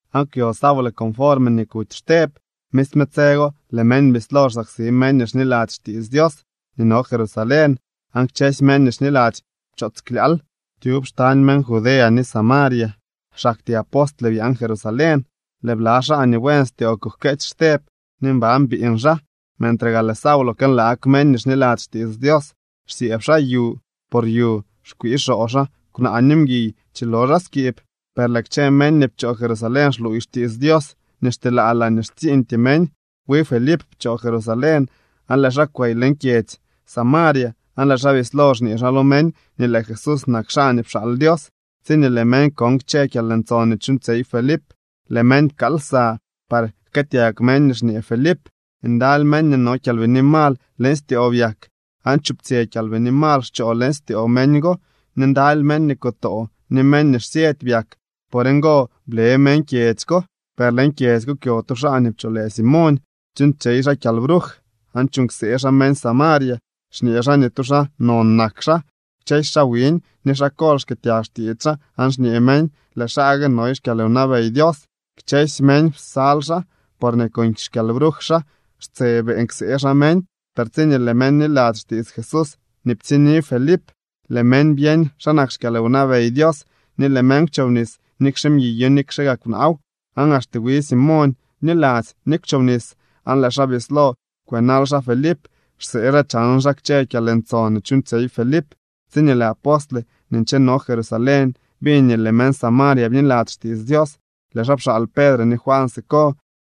Aan kwyo Saulo conforme nii kuty Xteb. Misme tse go lëë meñ bislo xsaksi meñ nii xniladzy xtiits Dios nii no Jerusalén aan kchësy meñ nii xniladzy pchoots klyaal tyub xtañ meñ Judea ni Samaria. Xaktyee apostle byaan Jerusalén. Lëë bla xaa nii buen styoo kujkeetsy Xteb ni mban biiñ xaa. Mentre gaa lëë Saulo kënlaag meñ nii xniladzy xtiits Dios, xsyëëb xaa yu por yu xkwii xoo xaa kwnaa ni mguiy chilo xaa skiib. Per lëë kchë meñ nii pchoo Jerusalén xluuy xtiits Dios nii xteelaa laañee xtsiiñtyee meñ. Wi Felip pchoo Jerusalén, aan lëë xaa kwey leñ kyedzy Samaria aan lëë xaa bislo xñee xaa lo meñ nii lëë Jesús nak xaa nii pxaal Dios. Tsiñee lëë meñ kon kchë kyalntson nii chuuñtsyey Felip, lëë meñ pkaal lsa par jkëëtyag meñ nii xñee Felip. Ndaly meñ nii no kyalbini mal leñ styoo byak, aan chuptsyë kyalbini mal xchoo leñ styoo meñ go, ni ndaly meñ nii kutoo ni meñ nii xsyëdy byak. Por ngo ble meñ kyedzy ko. Per leñ kyedzy ko kwyo tu xaa nii pcholë Simoñ. Chuuñtsyey xaa kyalbruj aan chuuñ ksee xaa meñ Samaria, xñee xaa nii tu xaa non nak xaa. Kchësy xaa wiñ ni xaa kol xkëëtyag xtiits xaa aan xñee meñ: —Lëë xaa gue noy xkyalwnabey Dios. Kchësy meñ psal xaa, porñee con xkyalbruj xaa xtse beeñ ksee xaa meñ. Per tsiñee lëë meñ bniladzy xtiits Jesús nii ptsiñni Felip, lëë meñ byeñ xa nak xkyalwnabey Dios, ni lëë meñ kwchobnis, nikxe mguiyo nikxe gaa kwnaaw. Aan axte wi Simoñ bniladzy ni kwchobnis, aan lëë xaa bislo kwënal xaa Felip, xsee xaa chan xaa kchë kyalntson nii chuuñtsyey Felip. Tsiñee lëë apostle nii ncheno Jerusalén biñ nii lëë meñ Samaria bniladzy xtiits Dios, lëë xaa pxaal Pedre ni Juan siko.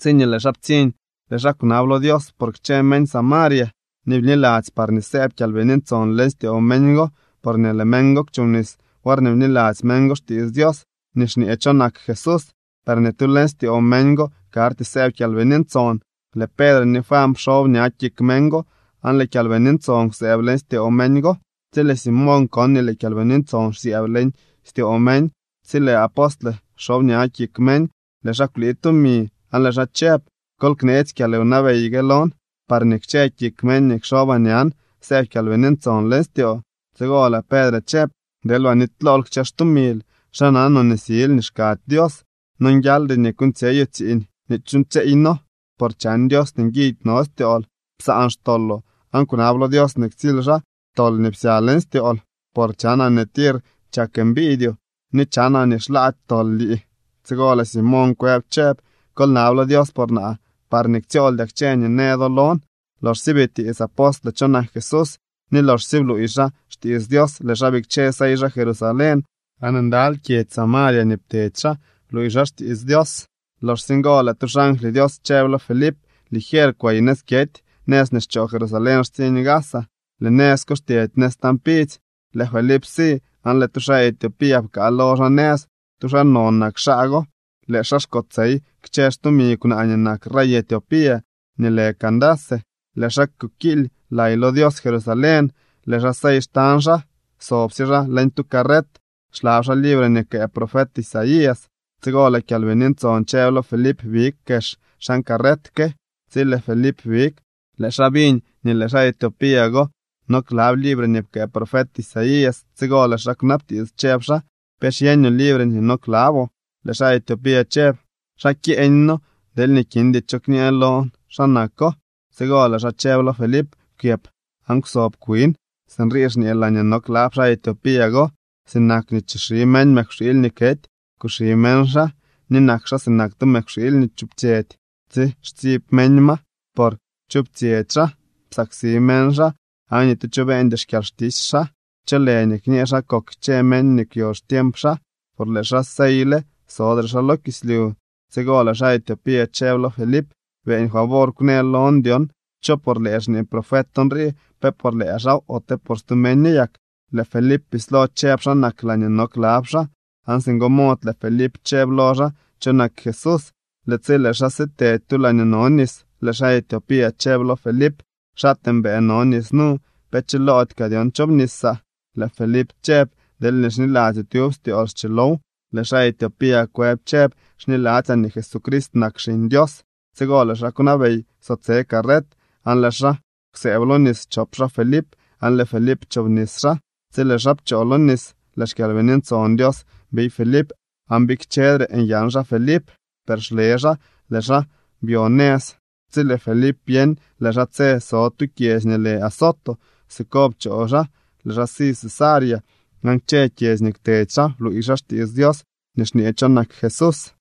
Tsiñee lëë xaa ptsiñ, lëë xaa kwnab lo Dios por kchë meñ Samaria nii bniladzy parñee sëëb Kyalbini Ntson leñ styoo meñ go. Porñee lëë meñ go kwchobnis worñee bniladzy meñ go xtiits Dios nii xñee cho nak Jesús, per ni tu leñ styoo meñ go karty sëëb Kyalbini Ntson. Lëë Pedre ni Juan pxob ña kik meñ go, aan lëë Kyalbini Ntson kwsëëb leñ styoo meñ go. Tsi lëë Simoñ kon nii lëë Kyalbini Ntson xsyëëb leñ styoo meñ tsi lëë apostle xob ña kik meñ, lëë xaa kwlii tumi, aan lëë xaa chëb: —Kol kneetsy kyalwnabey gue lon parñee kchë kik meñ nii kxobaa ñan sëëb Kyalbini Ntson leñ styoo. Tsigo lëë Pedre chëb: —Deelba nitylool kchë xtumil. ¿Xa nanoo nii sil nii xkady Dios? Nonguialdy nii kuuñtsyeyoo tsiiñ nii chuuñtsyeey noo, por chan Dios nii nguidy no styool. Psaan xtoloo, aan kwnab lo Dios nii ktsily xaa tol nii psya leñ styool. Por chanaa nii tir chak mbiidyoo, ni chanaa nii xlaady tol lii. Tsigo lëë Simoñ kwëb chëb: —Kol nab lo Dios por naa, parñee ktsyooldyaa kchë nii në do lon. Loxsye bitiits apostle cho nak Jesús, ni loxsye bluuy xaa xtiits Dios, lëë xaa bikche sey xaa Jerusalén, aan ndaly kyedzy Samaria nii ptedy xaa bluuy xaa xtiits Dios. Loxsye ngo, lëë tu xangly Dios chëb lo Felip: —Ligier kwey nëz kyety, nëz nii xchoo Jerusalén xtsiñ Gaza. Lëë nëz ko xtyedy nëz tañ pidzy. Lëë Felip si aan lëë tu xaa Etiopía pkaa lo xaa nëz. Tu xaa non nak xaa go, lëë xaa xkotsey kchë xtumi kwnaa nii nak rey Etiopía nii lë Candace. Lëë xaa kukiily lay lo Dios Jerusalén. Lëë xaa sey xtañ xaa, sobsye xaa leñ tu carret, xlab xaa libre nii pkëë profet Isaías. Tsigo lëë Kyalbini Ntson chëb lo Felip: —Big kex xan carret ke. Tsi lëë Felip big, lëë xaa biñ nii lëë xaa Etiopía go no klab libre nii pkëë profet Isaías. Tsigo lëë xaa kwnabtiits, chëb xaa: —¿Pe xyeeñoo libre nii no klaboo? Lëë xaa Etiopía chëb: —¿Xa kyeeñ no deelñee kindy cho kñë lon xa nako? Tsigo lëë xaa chëb lo Felip: —Kwyëp aan kwsob kwin. Sinrii xñee laañee no klab xaa Etiopía go: Sinak nii chixi meñ mëkwxiily nii kety, kuxi meñ xaa, ni nak xaa sinak tu mëkwxiily nii chuptsyëdy tsi xtsiib meñ ma, por kwchuptsyëdy xaa. Psaksi meñ xaa, aan ni tu cho beeñdy xkyalxtisy xaa. ¿Cho lë nii kñë xa kok kchë meñ nii kwyo xtiemp xaa? Por lëë xaa seyle, sodre xaa lo kislyu. Tsigo lëë xaa Etiopía chëb lo Felip: —Beeñ favor kwnë lon dyon cho por lëë xñee profet nrii, ¿pe por lëë xaaw, ote por stu meño yak? Lëë Felip bislo chëb xa nak laañee no klab xaa, aan singo mod lëë Felip chëb lo xaa cho nak Jesús. Lëë tsi lëë xaa sitedy tu laañee no nis, lëë xaa Etiopía chëb lo Felip: —Xaatee mbëë no nis nu. ¿Pe chiloody kaa dyon chobnisaa? Lëë Felip chëb: —Deelñee xniladzyoo tyub styool, schilow. Lëë xaa Etiopía kwëb chëb: —Xniladzyaa nii Jesucrist nak Xiñ Dios. Tsigo lëë xaa kwnabey kwsotse carret, aan lëë xaa kwsëëb lo nis chop xaa Felip, aan lëë Felip pchoobnis xaa. Tsi lëë xaa pchoo lo nis, lëë xKyalbini Ntson Dios biy Felip. Aan bikchedre nyan xaa Felip, per xle xaa lëë xaa byo nëz. Tsi lëë Felip byeñ lëë xaa tse so tu kyedzy nii lë Azoto, siko pchoo xaa lëë xaa si Cesarea. Aan kchë kyedzy nii kwtedy xaa bluuy xaa xtiits Dios nii xñee cho nak Jesús.